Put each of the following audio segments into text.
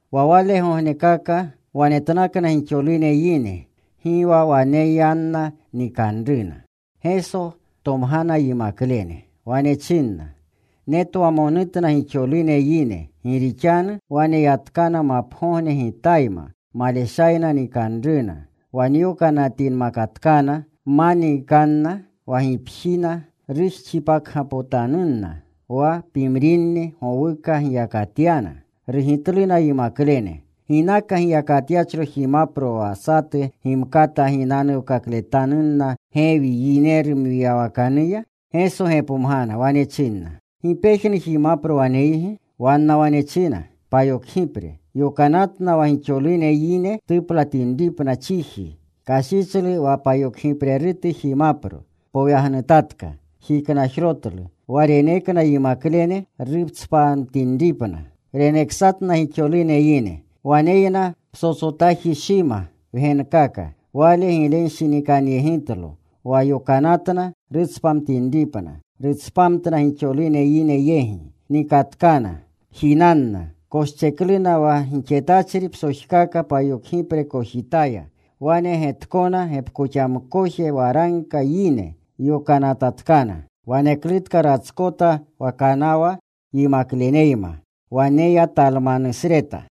Wa walegognekaka wanetnakna gixolune yine. Gi wa waneyanna nikanruna. Geso tomgana yimaklene. Wane chinna, “Netwamonutna gixolune yine, gi rixanu waneyatkana mapgogne Gitayma. Maleshayna nikanruna. Wa nyokanatinnatkana ma niikanna wa gipjina, rujxipakgapotanunna. Wa pimrinni gowuka giyakatyana.” Rugitluna yimaklene, “¿Ginaka giyakatyachro jimapro wa satu gimkata ginanuwkakletanunna gewi yineru mwiyawakanuya?” Geso gepomgana. Wane chinna, “¿Gi pejnu jimapro waneygi?” Wanna wane china, “Payokgipre.” Yokanatna wa gixolune yine tuplatinripna chiji. Kashichlu wa payokgiprerutu jimapro. Poyagnutatka. Jiknajrotlu. Wa renekna yimaklene rutspamtinripna. Reneksatna gixolune yine. Waneyna psotsotaji shima wgenkaka. Wale giglenshinikanyegitlo. Wa yokanatna rutspamtinripna. Rutspamtna gixolune yine yegi. Nikatkana. Jinanna. Koschekluna wa gixetachri psojkaka payokgipre kojitaya. Wanegetkona gepkoxamkoje waragka yine. Yokanatatkana. Waneklutka ratskota wa kanawa yimakleneyma. Wane ya Talmanutasreta.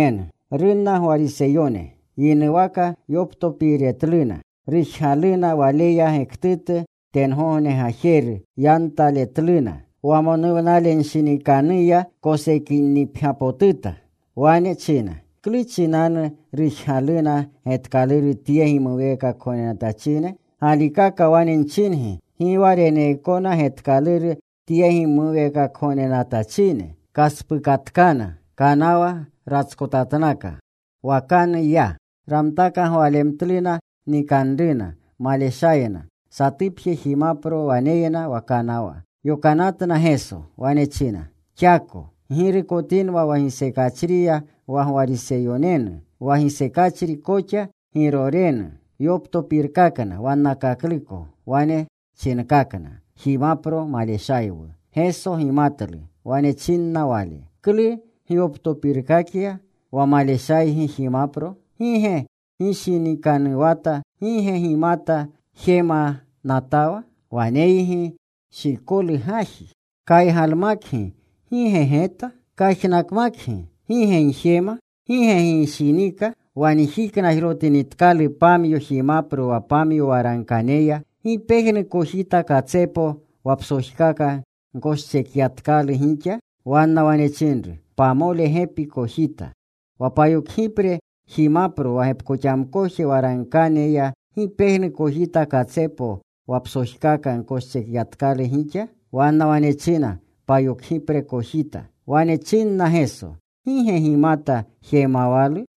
Runna Gwariseyone. Yinuwaka yoptopiiretluna. Rujgaluna Waleya getkaluru tengogne gajeru. Yantaletluna. Wamonuwnalenshinikanuya kosennipgyapotuta. Wane china, “¿Klu chinanu rujgaluna getkaluru tye gimuweekakgognenatachine? Galikaka wane nchingi, gi wa reneekona getkaluru tye gimuweekakgognenatachine.” Kaspukatkana. Kanawa ratskotatnaka. Wakanu ya. Ramtaka gwalemtluna nikanruna. Maleshayna. Satupje jimapro waneyna wa kanawa. Yokanatna Geso. Wane china, “Xako. Ggirukotinwa wa gisekachriya wa Gwariseyonenu, wa gisekachri koxa Girorenenu.” Yoptopirkakna wannakakluko. Wane chinkakna, “Jimapro maleshaywu.” Geso gimatlu. Wane chinna Wale, “¿Klu gyoptopirkakya wa maleshaygi jimapro? ¿Gi ge gishinikanuwatawa? ¿Gi ge gimata jemanatawa? ¿Waneygi shikolu gaji? Kaygalmakgi ¿gi ge geta? Kajnakmakgi ¿gi ge gjema? ¿Gi ge gishinika? Wa njiknajrotinitkalu pamyo jimapro wa pamyo waragkaneya ¿gi pejnu kojita katsepo wa psojkaka gkoschekyatkalu gixa?” Wanna wane chinru, “Pamole gepi kojita.” “Wa payokgipre jimapro wa gepkoxamkoje waragkaneya ¿gi pejnu kojita katsepo wa psojkaka gkoschekyatkalu gixa?” Wanna wane china, “Payokgipre kojita.” Wane chinna Geso, “¿Gi ge gimata jemawalu?”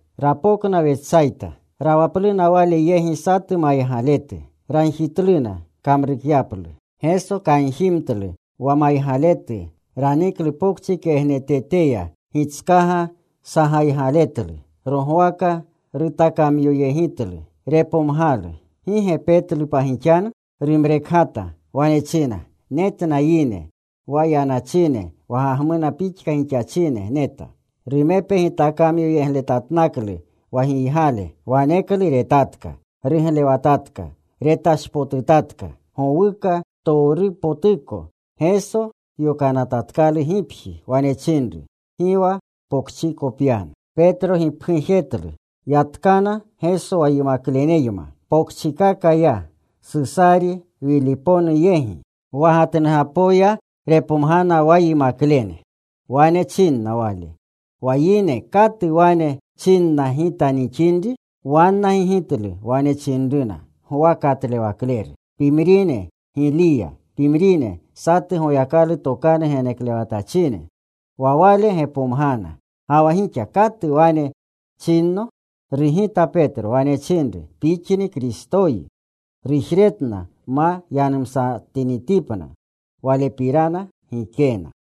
Rapokna Wetsayta. Rawapluna Wale yegi satu maygaletu. Ragjitluna kamrukyaplu. Geso kanjimtlu wa maygaletu. Raniklu pokchi kegneteya. Gitskaga sagaygaletlu. Rogwaka rutakamyoyegitlu. Repomgalu, “¿Gi ge petlu pa gixanu?” Rumrekgata. Wane china, “Netna yine, wa yanachine wa gagmuna pixka gixachine neta.” Rumepe gitakamyoyegletatnaklu wa giygale. Waneklu retatka. Ruglewatatka. Retashpotutatka gowuka ptowrupotuko. Geso yokanatatkalu gipji. Wane chinru, “Gi wa pokchiko pyanu.” Yatkana Geso wa yimakleneyma. Pokchikaka ya Susari Wiliponu yegi. Wa gatnugapoya repomgiyna wa yimaklene. Wane chinna Wale, “Wa yine ¿katu wane chinna Gita nixinri?” Wanna gigitlu. Wane chinruna, “ ‘Gwa Katlewakleru;’ pimrine, ‘Giliya;’ pimrine, ‘Satu Goyakalu tokanu geneklewatachine.’” Wa Wale gepomgana, “¿Ga wa gixa katu wane chinno?” Rugita Petro. Wane chinru, “Pixni Kristoyi.” Rujretna ma yanumsatinitipna Walepirana gikena.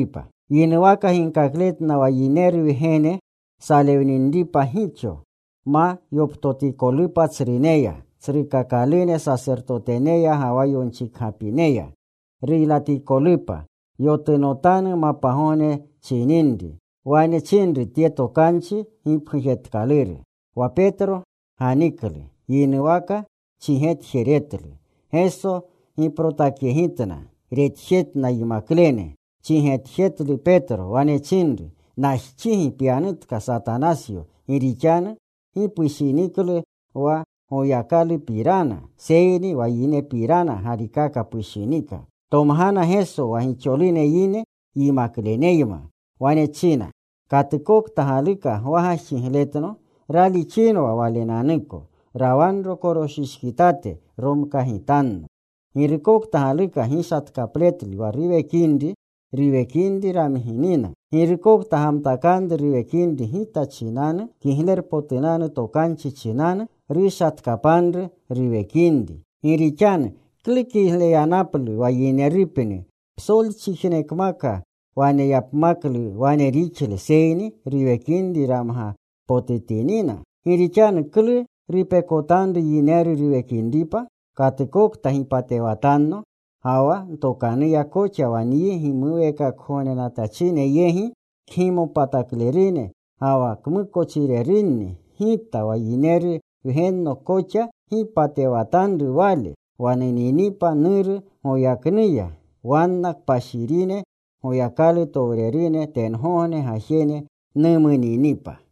Yinuwaka ginkakletna wa Yineru Wgene salewninripa gixo, ma yoptotikotupa tsruneya, tsrukakalune sasertoteneya, ga wa yonchikgapineya. Ruylatikolupa. Yotunotanu mapgogne chininri. Wane chinru tye tokanchi gipgujetkaluru. Wa Petro ganiklu. Yinuwaka chigetjeretlu. Geso giprotakyegitna. Retjetna yimaklene. Chigetjetlu Petro. Wane chinru, “Najxigi pyanutka, Satanasyo. Gi rixanu gi pushiniklu wa Goyakalupirana, seyni wa yinepirana galikaka pushinika.” Tomgana Geso wa gixolune yine yimakleneyma. Wane china, “Katukokta galuka gwagajxigletno raalixinwa walenanuko. Rawanro koroshishkitate. Romkagitanno. Girukokta galuka gishatkapletlu wa ruwekinri, ruwekinri ramginina. Girukokta gamtakanru ruwekinri Gita chinanu, Kiglerpotunanu Tokanchi chinanu, rushatkapanru ruwekinri. Gi rixanu ¿klu kigleyanaplu wa yinerupni psolchijnekmaka waneyapmaklu wane rixle, seyni ruwekinri ramgapotutinina? Gi rixanu ¿klu rupekotanru yineru ruwekinripa? Katukokta gipatewatanno ga wa ntokanuya koxa wa nyi gimuweekakgognenatachine yegi, kgimopataklerune ga wa kmukochirerunni, Gita wa Yineru Wgenno koxa gipatewatanru wale, wa nuninipa Nuru goyaknuya, wanna kpashirine Goyakalutowrerune tengogne gajene numuninipa.”